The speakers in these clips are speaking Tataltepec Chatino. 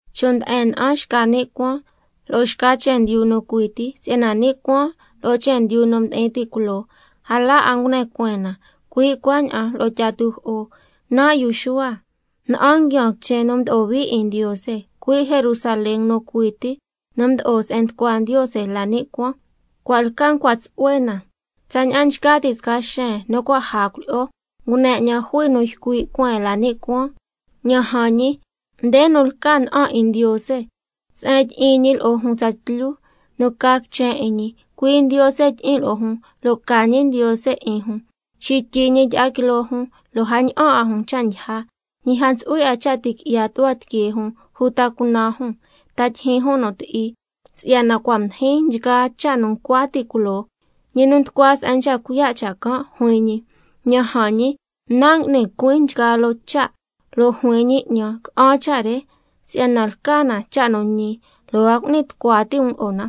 Chon' nde'en na'an xca ni' cuaan lo'o xca chendyu nu cui ti, si'yana ni' cuaan lo'o chendyu nu mdi'in ti' culoo, a la 'a ngune cueen na, cui' cuaña'an lo'o tyi'a tujo'o. Nan' yu Xuhua, na'an nguiaan quichen nu mdo'o hui 'in Ndiose, cui' Jerusalén nu cui ti, nu mdo'o se'en nducua Ndiose la ni' cuaan, cua' lca ncua tsu'hue na tsaña'an nchca ti' sca xen nu cua' caja cuilyi'o. Ngune 'ñan jui nu ycui' cueen la ni' cuaan: Ña'an jan ñi, nde nu lca na'an 'in Ndiose —se'en tyi'in ñi lo'o jun tsatlyu, nu ca quichen 'in ñi, cui' Ndiose tyi'in lo'o jun lo' ca ñi Ndiose 'in jun—. Xityi ñi tyi'a quiloo jun, lo' a ña'an 'a jun cha' ndyija, ñi a ntsu'hui 'a cha' ti' qui'ya tu'hua tiquee jun uta cunan jun, ta tyijyin jun nu ti'i, si'yana cua' mdijin nchgaa cha' nu ncua ti' culoo. Ñi nu nducua se'en nchca cuiya' cha' can', juin ñi: Ña'an jan ñi, Nan' ngui'nin cuin nchgaa loo cha'. Lo' juin ñi 'ñan: Ca'an cha' re, si'yana lca na cha' nu ñi lo' a cu'ni tucua ti' um lo'o na.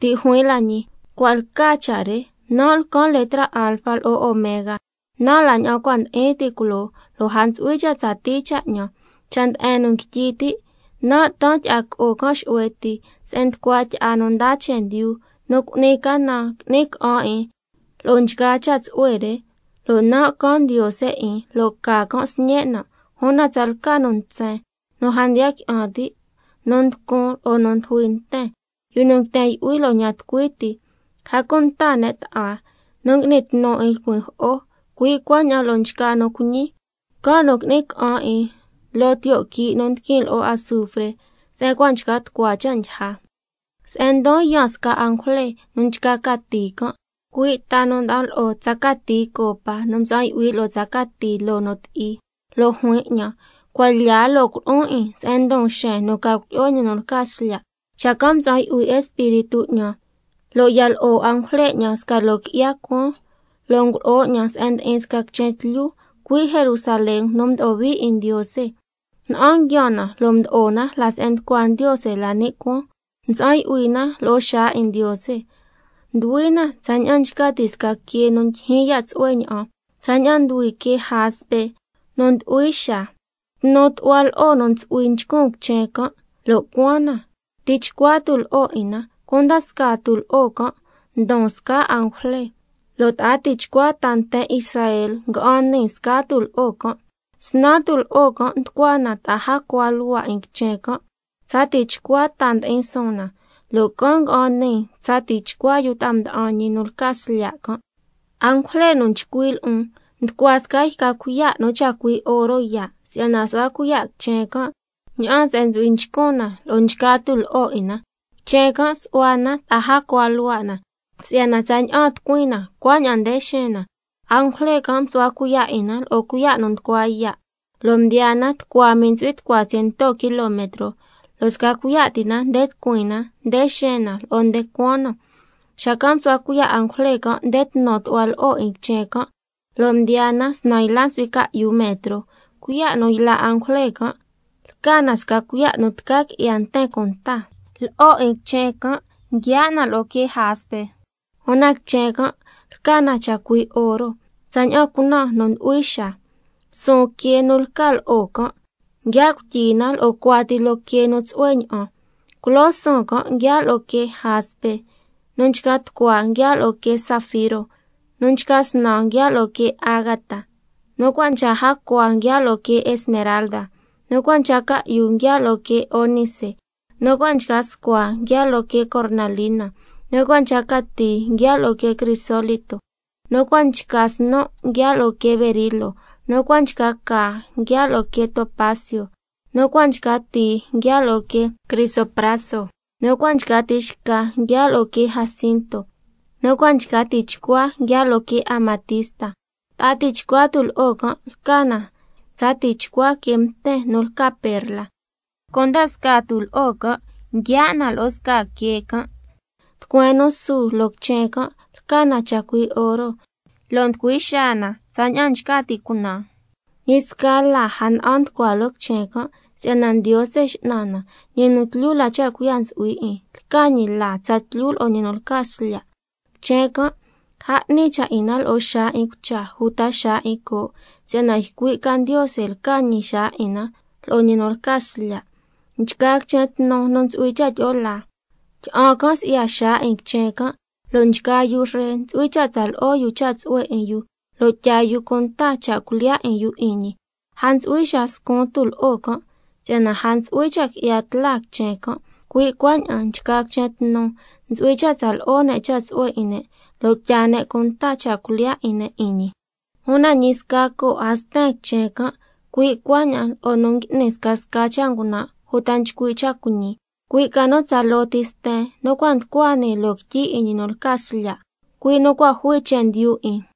Ti' juin la ñi: Cua' lca cha' re. Nan' lcan letra Alfa lo'o Omega, nan' la ña'an cua' ndi'in ti' culoo, lo' a ntsu'hui cha' tsatii cha' 'ñan. Cha' nde'en nu nguityi ti', nan' taan tyi'a co'o can' xu'hue ti, se'en nducua tyi'a nu ndaa chendyu. Nu cu'ni canan, qui'ni ca'an 'in lo'o nchgaa cha' tsu'hue re, lo' nan' can Ndiose 'in, lo' ca can' sñen' nan'. Una tsalca nu ntsen, nu a ndiya qui'an ti', nu nducun' lo'o nu ndujui nten, yu nu nguiten yu'hui lo'o ña'an tucui ti, a cunta ne' bta'a, nu ngui'ni tnu 'in lcuin jo'o, cui' cuaña'an lo'o nchgaa nu cuiñi, can' nu qui'ni ca'an 'in loo tiyo' quii' nu ndiquin lo'o azufre se'en cua' nchca tucua cha' ndyija. Se'en ndon yaan sca angujle nu nchca cati can', cui' ta nu nda'an lo'o tsa cati copa nu mtsa'an yu'hui lo'o tsa cati loo nu ti'i, lo' juin 'ñan: Cuan lya lo' culo'on 'in se'en ndon xen nu lca cuilyi'o ñi nu lca Slya'. Xacan' mtsa'an yu'hui Espíritu 'ñan, lo' ya lo'o angujle 'ñan sca loo qui'ya cuaan, lo' ngulo'o 'ñan se'en ndi'in sca quichen tlyu, cui' Jerusalén nu mdo'o hui 'in Ndiose, na'an nguiaan na lo' mdo'o na la se'en nducua Ndiose la ni' cuaan, lo' mtsa'an yu'hui na lo'o xaa 'in Ndiose. Nduhui na tsaña'an nchca ti' sca quee nu ndyijyin ya' tsu'hue ña'an, tsaña'an nduhui quee jaspe nu nducui xaa. Tnu tu'hua lo'o nu ntsu'hui nchcun quichen can' lo' cuaan na, tichcua tulo'o 'in na, cunda scaa tulo'o can' ndon scaa angujle, lo' ta'a tichcua ta nten Israel nga'an nii scaa tulo'o can', snaan tulo'o can' nducua na ta'a jacua luhua' 'in quichen can'. Tsa tichcua ta ndi'in suun na, lo' can' nga'an nii tsa tichcua yu ta'a mda'an ñi nu lca Slya' can'. Angujle nu nchcui' lo'on nducua sca yca cuiya' nu chacui' oro yaa', si'yana su'hua cuiya' quichen can' ña'aan se'en ntsu'hui nchcun na lo'o nchgaa tulo'o 'in na. Quichen can' su'hua na ta'a jacua luhua' na, si'yana tsaña'an tucuin na cuaña'an nde xeen na. Angujle can' msu'hua cuiya' 'in na lo'o cuiya' nu nducua yaa', lo' ndiyaa na tucua mii ntsu'hui tucua ciento kilometro, lo' sca cuiya' ti na nde tucuin na, nde xeen na, lo'o nde cuaan na. Xacan' msu'hua cuiya' angujle can' nde tnu tu'hua lo'o 'in quichen can', lo' ndiyaa na snan yla ntsu'hui ca'yu metro. Cuiya' nu yla' angujle can' lca na sca cuiya' nu tca qui'ya nten cunta. Lo'o 'in quichen can' nguiaa' na lo'o quee jaspe, una quichen can' lca na chacui' oro, tsaña'an cunan nu nducui xaa. Suun quee nu lca lo'o can', nguiaa' cuityi na lo'o cuati loo quee nu tsu'hue ña'an: Culoo suun can' nguiaa' lo'o quee jaspe, nu nchca tucua nguiaa' lo'o quee zafiro, nu nchca snan nguiaa' lo'o quee ágata, nu cua' nchca jacua nguiaa' lo'o quee esmeralda, nu cua' nchca ca'yu nguiaa' lo'o quee ónice, nu cua' nchca scua nguiaa' lo'o quee cornalina, nu cua' nchca cati nguiaa' lo'o quee crisólito, nu cua' nchca snu' nguiaa' lo'o quee berilo, nu cua' nchca caa nguiaa' lo'o quee topacio, nu cua' nchca tii nguiaa' lo'o quee crisopraso, nu cua' nchca tixca nguiaa' lo'o quee jacinto, lo' nu cua' nchca tichcua nguiaa' lo'o quee amatista. Ta'a tichcua tulo'o can' lca na tsa tichcua quee mten nu lca perla, cunda scaa tulo'o can' nguiaa' na lo'o scaa quee can'. Tucueen nu su loo quichen can' lca na chacui' oro, lo' nducui xaa na tsaña'an nchca ti' cunan. Ñi sca laa a na'an nducua loo quichen can', si'yana Ndiose X'nan na, ñi nu tlyu la cha' cuiya' ntsu'hui 'in, lca ñi laa tsatlyu lo'o ñi nu lca Slya'. Quichen can' a 'ni cha' 'in na lo'o xaa 'in cucha uta xaa 'in coo', si'yana ycui' ca Ndiose lca ñi xaa 'in na lo'o ñi nu lca Slya'. Nchgaa quichen tnu nu ntsu'hui cha' tyi'o laa, tyi'an can' si'ya xaa 'in quichen can', lo' nchgaa yu ree ntsu'hui cha' tsa lo'o yu cha' tsu'hue 'in yu lo' tyaa yu cunta cha' cuilyiya' 'in yu 'in ñi. A ntsu'hui xaa scun tulo'o can', si'yana a ntsu'hui cha' qui'ya tla quichen can'. Cui' cuaña'an nchgaa quichen tnu ntsu'hui cha' tsa lo'o ne' cha' tsu'hue 'in ne', lo' tyaa ne' cunta cha' cuilyiya' 'in ne' 'in ñi, una ñi sca coo' a sten quichen can', cui' cuaña'an lo'o nu ngui'ni scasca cha' ngunan' uta nchcui' cha' cuiñi, cui' ca nu tsaloo ti sten nu cua' nducua nii loo quityi 'in ñi nu lca Slya', cui' nu cua' jui chendyu 'in.